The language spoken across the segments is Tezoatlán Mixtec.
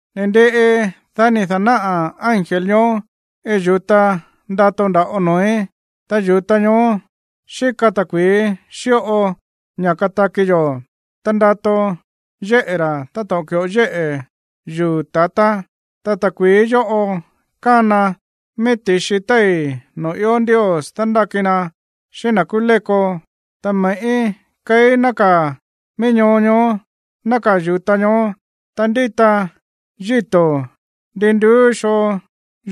Ni̱ ndiꞌi, dá ni̱ da̱náꞌa̱ ángel ñoó iin yu̱ta ndato nda̱ꞌo noo̱í. Ta yu̱ta ñoó xíka ta̱kui̱í xíꞌo ña̱ kataki yo̱, ta ndato yéꞌe̱ ra̱ táto̱ꞌon ki̱ꞌo yéꞌe̱ yuu̱ ta̱tá. Ta ta̱kui̱í yóꞌo kána mií ti̱xi téi̱ noo̱ ió Ndios dándáki na xíꞌín na̱ kúú léko. Ta me̱ꞌí keí nákaa̱ mií ñoo ñoó nákaa̱ yu̱ta ñoó. Ta ndíta yíto̱ ndin nduú xoo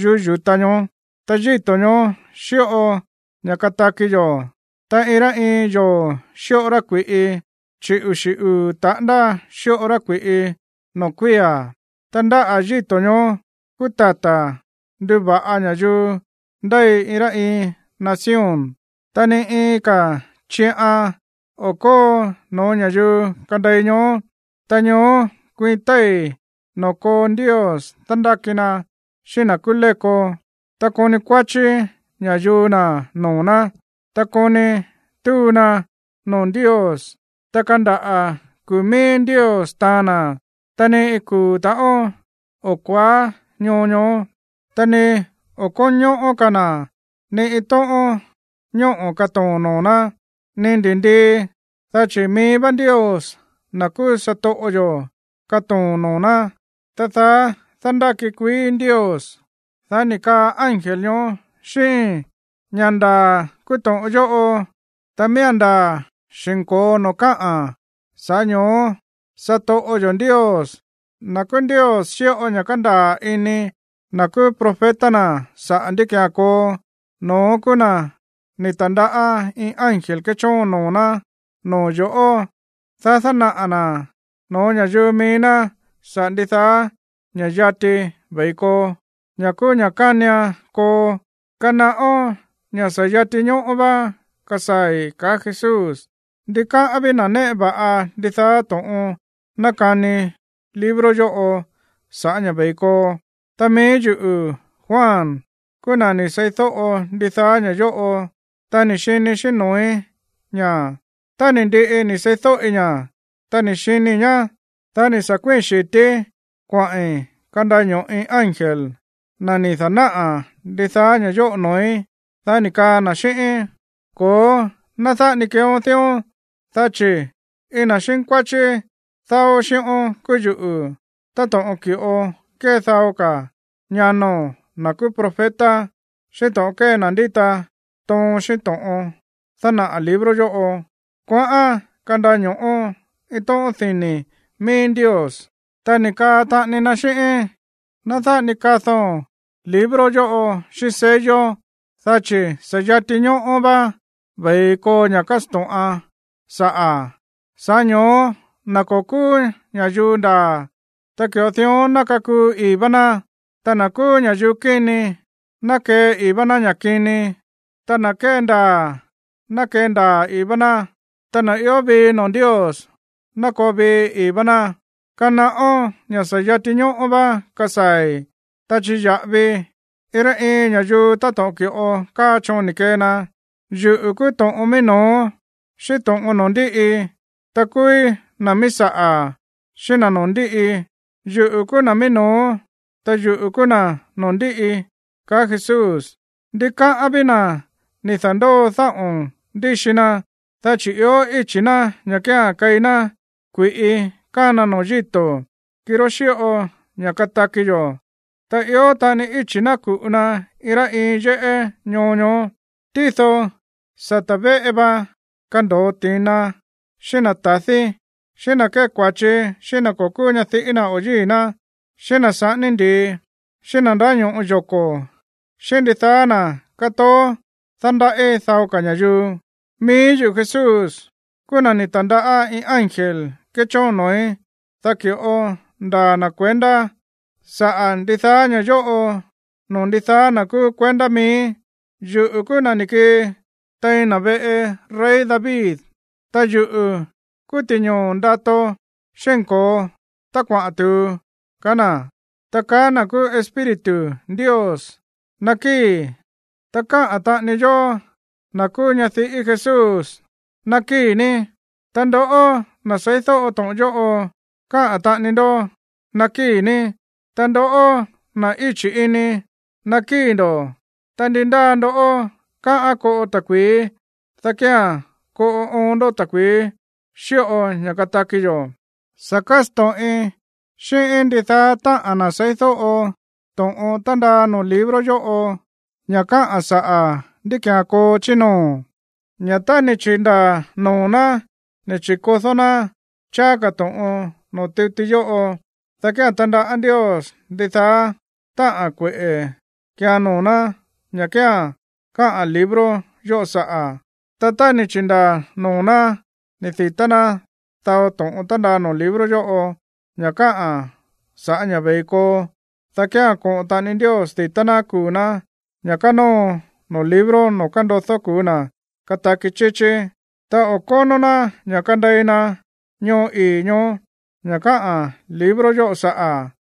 yuꞌú yu̱ta ñoó, ta yíto̱ ñoó xíꞌo ña̱ kataki yo̱. Ta iin rá iin yoo̱ xíꞌo rá kui̱ꞌi, chi̱ uxi̱ uu̱ taꞌándá xíꞌo rá kui̱ꞌi noo̱ kuía̱. Ta ndáꞌa̱ yíto̱ ñoó kúú tata̱ nduva̱ꞌa ña̱yuu ndéi iin rá iin nación. Ta ni iin ka̱ chiꞌan o̱ kóo no̱ó ña̱yuu kandei ñoó. Ta ñoó kuiin téi̱ noo̱ koo Ndios dándáki na xíꞌín na̱ kúú léko, ta koni kuáchí ña̱yuu na̱ noo̱ ná. Ta koni túu na noo̱ Ndios, ta kandaꞌa̱ kuu̱ mií Ndios taan na̱. Ta ni iin kuu̱ ta̱ꞌón o̱ kuaá ñoo ñoó. Ta ni o̱ kónñóꞌó ka̱ na̱ ni iin tóꞌón ñóꞌo̱ katoo̱n noo̱ ná, ni ndi̱ndii, dá chi̱ mií vá Ndios, na̱ kúú satoꞌo yo̱, katoo̱n noo̱ ná. Ta daá dándáki kuií Ndios. Dá ni̱ kaa ángel ñoó xíꞌíín: ―Ña̱ ndaa̱ kúú to̱ꞌon yóꞌo, ta miía̱n ndaa̱ xi̱nko̱o noo̱ káꞌa̱n. Sa̱ꞌá ño̱ó satoꞌo yo̱ Ndios, na̱ kúú Ndios xíꞌo ña̱ kándaa̱ ini na̱ kúú profeta na̱ saꞌa̱ ndí ki̱án koo, no̱ón kúú na̱ ni̱ ta̱ndaꞌá iin ángel kéchóon noo̱ ná noo̱ yo̱ꞌó, dá dánaꞌa̱ na̱ no̱ó ña̱yuu mií ná saꞌa̱ ndidaá ña̱ yati ve̱i koo, ña̱ kúú ña̱ kánian koo. ―Kanaꞌón ña̱ sa̱ yati ñóꞌó vá kasaa̱i̱ ―kaá Jesús. Ndikáꞌán ví na̱ néꞌe va̱ꞌa ndidaá to̱ꞌon nákani libro yóꞌo sa̱ꞌá ña̱ ve̱i koo. Ta mií yuꞌu̱, Juan, kúú na̱ ni̱ seídóꞌo ndidaá ña̱ yóꞌo, ta ni̱ xinii̱ xíꞌín noo̱í ña̱. Tá ni̱ ndiꞌi ni̱ seídóꞌi ña̱, ta ni̱ xinii̱ ñá, dá ni̱ sa̱ kuíi̱n xi̱tíí kuaꞌi̱n kandaño̱ꞌi ángel, na̱ ni̱ dánaꞌa̱ ndidaá ña̱ yóꞌo noo̱í. Dá ni̱ kaa na̱ xíꞌíín: ―Ko̱ó, ná dáꞌa ni keeón dión, dá chi̱ iin na̱ xínkuáchí dáó xíꞌón kúú yuꞌu̱, táto̱ꞌon ki̱ꞌo kée dao ka̱ ñano̱n, na̱ kúú profeta, xíꞌín to̱ꞌon kée na̱ ndíta toon xíꞌín to̱ꞌon dánaꞌa̱ libro yóꞌo. Kuaꞌán kandaño̱ꞌo iin tóꞌón dini̱ mií Ndios. Ta ni̱ kaa taꞌani na xíꞌíín: ―Ná dáꞌa ni kado̱n libro yóꞌo xíꞌín sello, dá chi̱ sa̱ yati ñóꞌó vá ve̱i koo ña̱ kásto̱ꞌan saꞌa̱. Sa̱ꞌá ño̱ó na̱ ko̱ kúú ña̱yuu ndaa̱, ta ki̱ꞌo dión ná kakuu ii̱ vá ná. Ta na̱ kúú ña̱yuu kíni, ná kee ii̱ vá ná ña̱ kini. Ta na̱ kéndaa̱, ná kendaa̱ ii̱ vá ná. Ta na̱ ió vii noo̱ Ndios, ná koo vii ii̱ vá ná. ―¡Kanaꞌón ña̱ sa̱ yati ñóꞌó vá kasaa̱i̱! Ta chiya̱ꞌavii iin rá iin ña̱yuu táto̱ꞌon ki̱ꞌo káa choon ni̱ kee na. Yuꞌu̱ kúú to̱ꞌon mií no̱ó xíꞌín to̱ꞌon noo̱ ndíꞌi, ta kúúí na̱ míí saꞌa̱ xíꞌín na̱ noo̱ ndíꞌi. Yuꞌu̱ kúú na̱ míí no̱ó, ta yuꞌu̱ kúú na̱ noo̱ ndíꞌi ―kaá Jesús. Ndikáꞌán ví na̱ ni̱ da̱ndóo dáꞌo̱n ndíxi na, dá chi̱ ió íchi̱ ná ña̱ kía̱n keí ná kui̱ꞌi kána noo̱ yíto̱, kirá xíꞌo ña̱ kataki yo̱. Ta ió taꞌani íchi̱ ná ku̱ꞌu na iin rá iin yéꞌé ñoo ñoó. Tído sata̱ véꞌe va kando̱o ti̱na, xíꞌín na̱ ta̱dí, xíꞌín na̱ kée kua̱chi xíꞌín na̱ ko̱ kúú ñadiꞌí na̱ o yíi̱ ná, xíꞌín na̱ saꞌání ndi̱i, xíꞌín na̱ ndáño̱ꞌo yoko̱, xíꞌín ndidaá na̱ kátoó dándaꞌí dao ka̱ ña̱yuu. ―Mií yuꞌu̱, Jesús, kúú na̱ ni̱ ta̱ndaꞌá iin ángel kéchóon noo̱í, dá ki̱ꞌo ndaa̱ na̱ kuendá saꞌa̱ ndidaá ña̱ yóꞌo noo̱ ndidaá na̱ kúú kuendá miíí. Yuꞌu̱ kúú na̱ ni̱ kii tein na̱ veꞌe rey David, ta yuꞌu̱ kúú ti̱ñoo̱ ndato xínko̱o tá kuaꞌa̱n tu̱u ―kaá na̱. Ta kaá na̱ kúú Espíritu Ndios: ―Nakíi̱. Ta kaá taꞌani yó, na̱ kúú ñadiꞌí Jesús: ―Nakíi̱ ní. Ta ndoꞌó, na̱ seídóꞌo to̱ꞌon yóꞌo, kaa taꞌani ndó: ―Nakíi̱ ní. Ta ndoꞌó, na̱ íchi̱ ini, nakíi̱ ndo̱. Ta ndi ndáa ndó káꞌán koꞌo ta̱kui̱í, dá kía̱n koꞌo oon ndó ta̱kui̱í xíꞌo ña̱ kataki yo̱. Sa̱ kásto̱ꞌin xíꞌín ndidaá táꞌa̱n na̱ seídóꞌo to̱ꞌon tándaa noo̱ libro yóꞌo, ña̱ káꞌa̱n saꞌa̱ ndí ki̱án koo chí noo̱, ña̱ tá ni̱ chi̱ndaa̱ noo̱ ná ni̱ chi̱kodó ná cháá ka̱ to̱ꞌon noo̱ tuti yóꞌo, dá kía̱n tandaꞌá Ndios ndidaá táꞌa̱n kueꞌe̱ kiian noo̱ ná, ña̱ kía̱n káꞌa̱n libro yóꞌo saꞌa̱. Ta tá ni̱ chi̱ndaa̱ noo̱ ná ni̱ di̱tá ná dao to̱ꞌon tándaa noo̱ libro yóꞌo, ña̱ káꞌa̱n sa̱ꞌá ña̱ ve̱i koo, dá kía̱n koꞌo̱n taꞌani Ndios di̱tá ná kuu̱ ná, ña̱ kánóo noo̱ libro noo̱ kándodó kuu̱ na̱ kataki chíchí, ta o̱ kónó ná ña̱ kandei na ñoo ii̱ ñoó, ña̱ káꞌa̱n libro yóꞌo saꞌa̱.